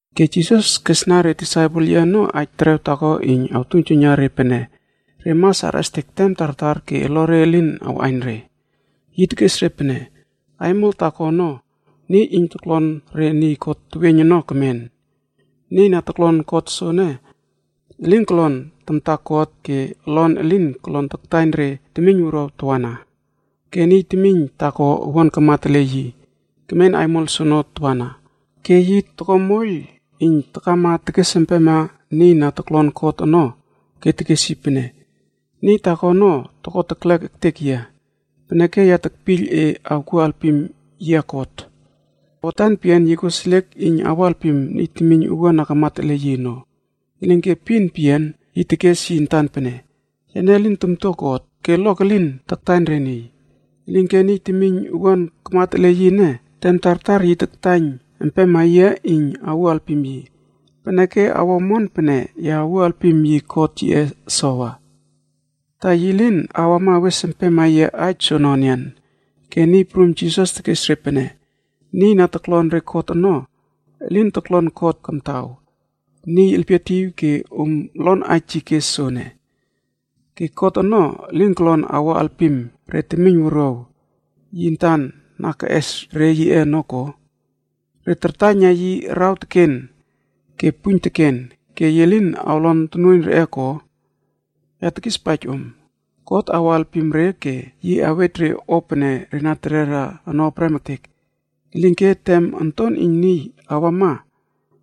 Ke Jisas kesna re disaipel yiꞌe ono aij terew taako iyn awtuiynjuiyna re pene re mas arꞌestek tem tartar ke olore elin awꞌaiyn re. Yi tekes re pene, “Aimol taako ono, niy iyn toklon re niy kot teweiyn ono kemen. Niy na toklon kot soene elin kolon tamta God ke olon elin kolon taktaiyn re temiyn wuruaw tawana. Ke niy temiyn taako owuan kamat ele yi, kemen aimol soono tawana, ke yi toko moiyl iyn takama tekes empema niy na toklon kot ono ke tekes yi pene, ‘Niy taako ono toko teklek ektek yia, peneke ya tekpiyl e awkuo alpim yia kot.’ “Watan peyian yi koseliek iyn awo alpim niy temiyn owuan na kamat ele yi ono. Elinke epin peyian yi tekes yi antan pene, ‘Yane lin tamtua God, ke olok elin taktaiyn re niy. Elinke niy temiyn owuan kamat ele yi ene, tem tartar yi taktaiyn empema yia iyn awuo alpim yi. Peneke, awo omon pene ya awuo alpim yi kot yiꞌe sowa, ta yi lin awama awes empema yia aij soono enian.’” Ke Niy Prum Jisas tekes re pene, “Niy na toklon re kot ono, elin toklon kot kamtaw, niy elpietiw ke om lon aij yi kes soene. Ke God ono elin kolon awo alpim re temiyn wuruaw yi antan na keꞌes re yiꞌe ono ko? Re tartaiyna yi araw teken ke puiyn teken ke yi lin awlon tonuoiyn reꞌe ko? Ya tekispaij om, God awo alpim re ke yi awej re o pene re na terera ono prem ektek. Elinke, tem Onton iyn Niy awama,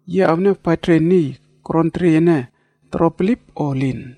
yi awniawpaij re niy koron teriey ene toro bilip o elin?”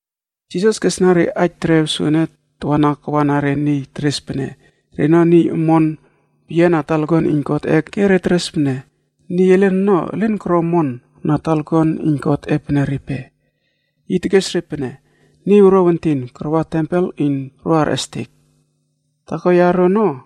Jisas kesna re aij terew soene tawana kawana re niy teres pene reno niy omon peyian na talakuan iyn Godꞌe ke teres pene niy elen ono elin koro omon na talakuan iyn Godꞌe pene repe. Yi tekes re pene, “Niy wuruaw entin karwa tempel iyn ro arꞌestek. Taako yaro ono,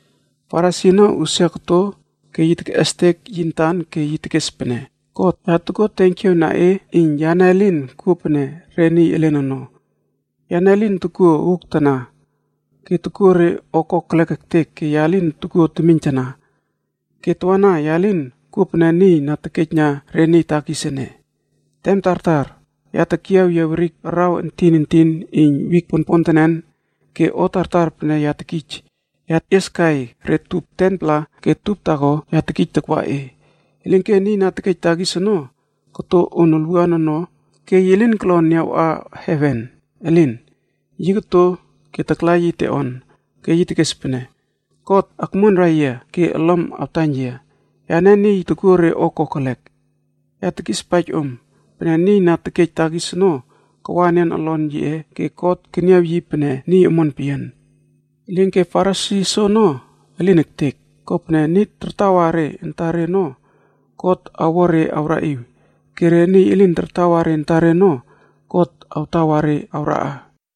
Farisi ono usia koto ke yi tekꞌestek tekes pene, ‘God, ya tokuo tenkiaw na e iyn yane elin kuo pene re niy elen ono. Yane elin tokuo uuktana, ke tokuo re o kokelek ektek ke ya lin tokuo temiyntana. Ke tawana ya lin kuo pene niy iyn tekejna re temiyn wuruaw takis ene. Tem tartar, ya tekyiaw yia werik araw entin entin iyn wik ponpontenen ke o tartar pene ya tekij, ya tekꞌieskai re tup 10-pla ke tup taako ya tekij takwa e.’ “Elinke niy iyn tekejna re temiyn wuruaw takis ono koto on olwuan ono ke yi lin kolon niawꞌa heven, elin! Yi koto ke takla yi teꞌonb ono ke yi tekes pene, ‘God akmuonrai yia ke olom awtaiyn yia. Yane niy iyn tokuo re o kokelek.’ “Ya tekispaij om pene niy na tekej takis ono kawa enian olon yiꞌe ke God keniaw yi pene niy omon peyian. Elinke Farisi soono elin ektek. Kopene niy tartawa re antare ono God awo re awraꞌiw ke re niy elin tartawa re antare ono God awtawa re awraꞌa.”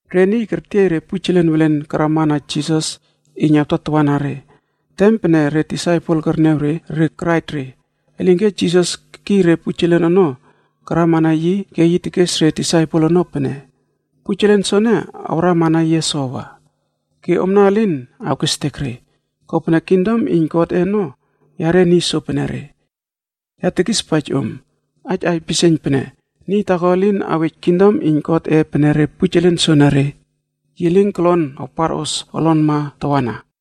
Re niy kertiey re pujelen welen karama na Jisas iyn awtatawana re. Tem pene re disaipel kerniaw re, re karaij re. Elinke, Jisas kekiy re pujelen ono karama na yi ke yi tekes re disaipel ono pene, “Pujelen soene awrama na yia sowa, ke omna elin awkestek re. Kopene kingdom iyn Godꞌe ono yare niy sopenere. Ya tekispaij om aij aipisieiyn pene niy taako elin awej kingdom iyn Godꞌe pene re pujelen soenere, yi lin kolon awparos olonma tawana.”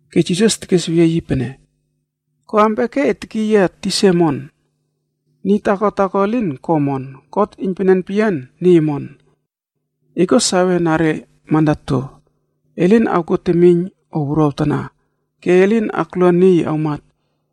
Ke Jisas tekes weyie yi pene, “Ko ampia ke e tekiy yia tisa omon? Niy taako taako elin ko omon. God iynpenen peyian niy omon. E kuo sawe re mandato: E lin awkuo temiyn o wuruaw tana, ke e lin aklua niy awmat,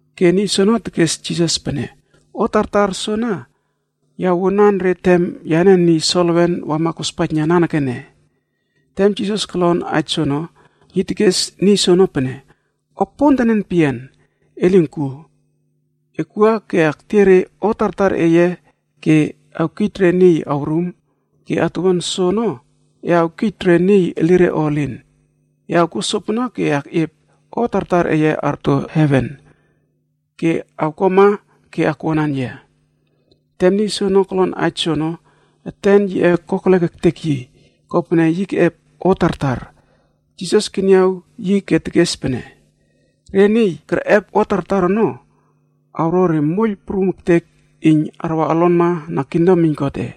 Ke niy soono tekes Jisas pene, “O tartar soana ya wuanan re tem yane niy solewen wama kospaijna nanekene.” Tem Jisas kolon aij soono, yi tekes niy soono pene, “O pontenen peyian e lin kuo. Ekwua ke ektiey re o tartar eye ke ewkij re niy awrum ke atuwuan soono e awkij re niy elire o elin. E awkuo sopene ke e akꞌiep o tartar eye arto heven. Ke awkuama ke akwuanan yia.” Tem niy soono kolon aij soono, eten yiꞌe kokelek ektek yi. Kopene yi keꞌep o tartar. Jisas keniaw yi ke tekes pene, “Re niy kerꞌep o tartar ono, awo re moiyl prum ektek iyn arwa olonma na kingdom iyn Godꞌe.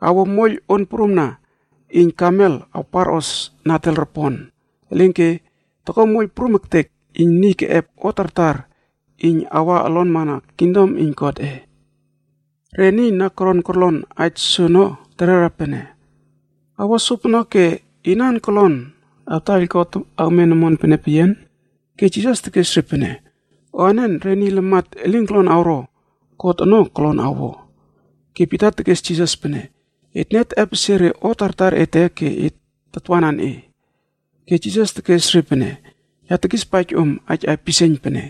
Awo moiyl on prumna iyn kameld awparꞌos nadel ropon, elinke toko moiyl prum ektek iyn niy keꞌep o tartar iyn awa olonma na kingdom iyn Godꞌe.” Re niy na koron korlon aij soono terera pene, “Awo sopono, ke inan kolon awtaiyl God awmen omon pene peyian?” Ke Jisas tekes re pene, “O anen re niy lamat elin kolon awro, God ono kolon awo.” Ke Pita tekes Jisas pene, “Etne teꞌepesie re o tartar ete ke et tatwanan e.” Ke Jisas tekes re pene, “Ya tekispaij om aij aipisieiyn pene,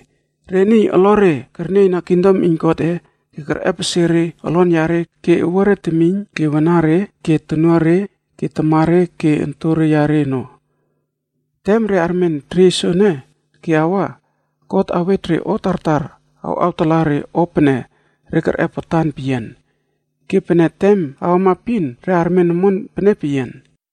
re niy olore kernieyna kingdom iyn Godꞌe ke kerꞌepesie re olon yare ke owuare temiyn ke wanare ke tonuare ke tamare ke ontore yare ono, Tem re armen teriey soene ke awa, God awej re o tartar awꞌawtala re o pene re kerꞌep watan peyian. Ke pene tem awama epin, re armen omon pene peyian.”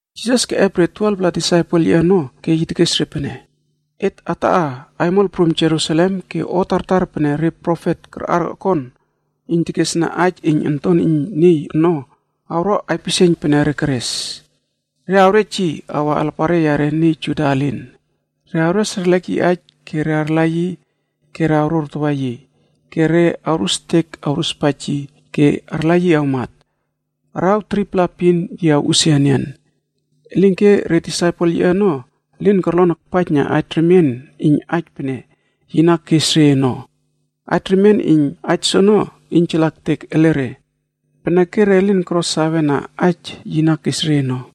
Jisas keꞌep re niy 12-pla na tarwanan yi ono ke yi tekes re pene, “Et ataꞌa aimol prum Jerusalem ke o tartar pene re profet karꞌar okon iyn teresna aij iyn Onton iyn Niy ono awro aipisieiyn pene re keres. Re awrej yi awa alapare yare niy Juda elin.e Re awres erlek yi aij ke re arla yi ke re awrorpem yi tokore renen. ke re awrustek awruspaij yi ke arla yi awmat. Araw 3-pla epin yi awꞌusia enian.” Elinke re disaipel yiꞌe ono elin korlon akpaijna aij remien iyn aij pene yi na kes re ono. Aij remien iyn aij soono iynjala ektek ele re. Peneke re lin koro sawe na aij yi na kes re ono.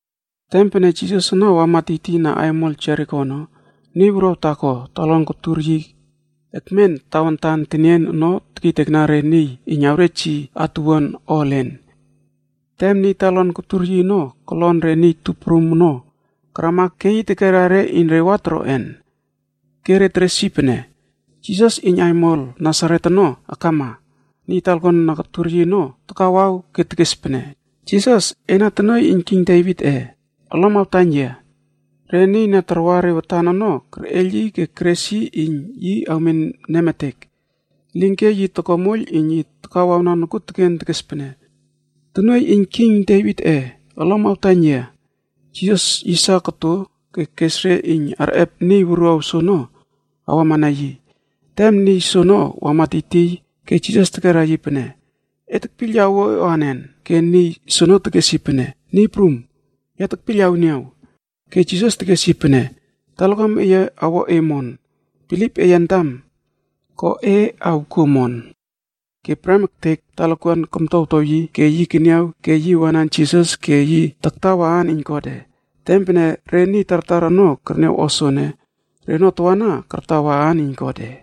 Tem pene Jisas ono wama tiytiyna aimol Jeriko ono, niy wuruaw taako talakuan kotur yi ekmen tawantan tenien ono taktaiyna re niy iyn awrej yi atuwuan o elen. Tem niy talakuan kotur yi ono kolon re niy tup prum ono akrama ke yi tekera re iyn re wa toroꞌen. Ke re teres yi pene, “Jisas iyn aimol Nasaret ono akama.” Niy talakuan na kotur yi ono takawaw ke tekes pene, “Jisas, ena tonuoiy iyn king Devitꞌe,f olom awtaiyn yia.” Re niy na tarwa re watan ono kerꞌeiyl yi ke keres yi iyn yi awmen nemetek. Elinke yi toko moiyl iyn yi takawawna nokuoteken tekes pene, “Tonuoiy iyn king Devitꞌe, olom awtaiyn yia.” Jisas yisa koto ke kes re iyn arꞌep niy wuruaw soono awama na yi. Tem niy soono wama tiytiy ke Jisas tekera yi pene, “E tekpiyl ya awuo e anen?” Ke niy soono tekes yi pene, “Niy Prum, ya tekpiyl awniaw.” Ke Jisas tekes yi pene, “Talakuam eye awo e omon. Bilip eye antam ko e awkuo omon.” Ke prem ektek talakuan komtowtow yi ke yi keniaw ke yi wanan Jisas ke yi taktawa aan iyn Godꞌe. Tem pene re niy tartar ono kerniaw o soene, reno tawana kartawa aan iyn Godꞌe.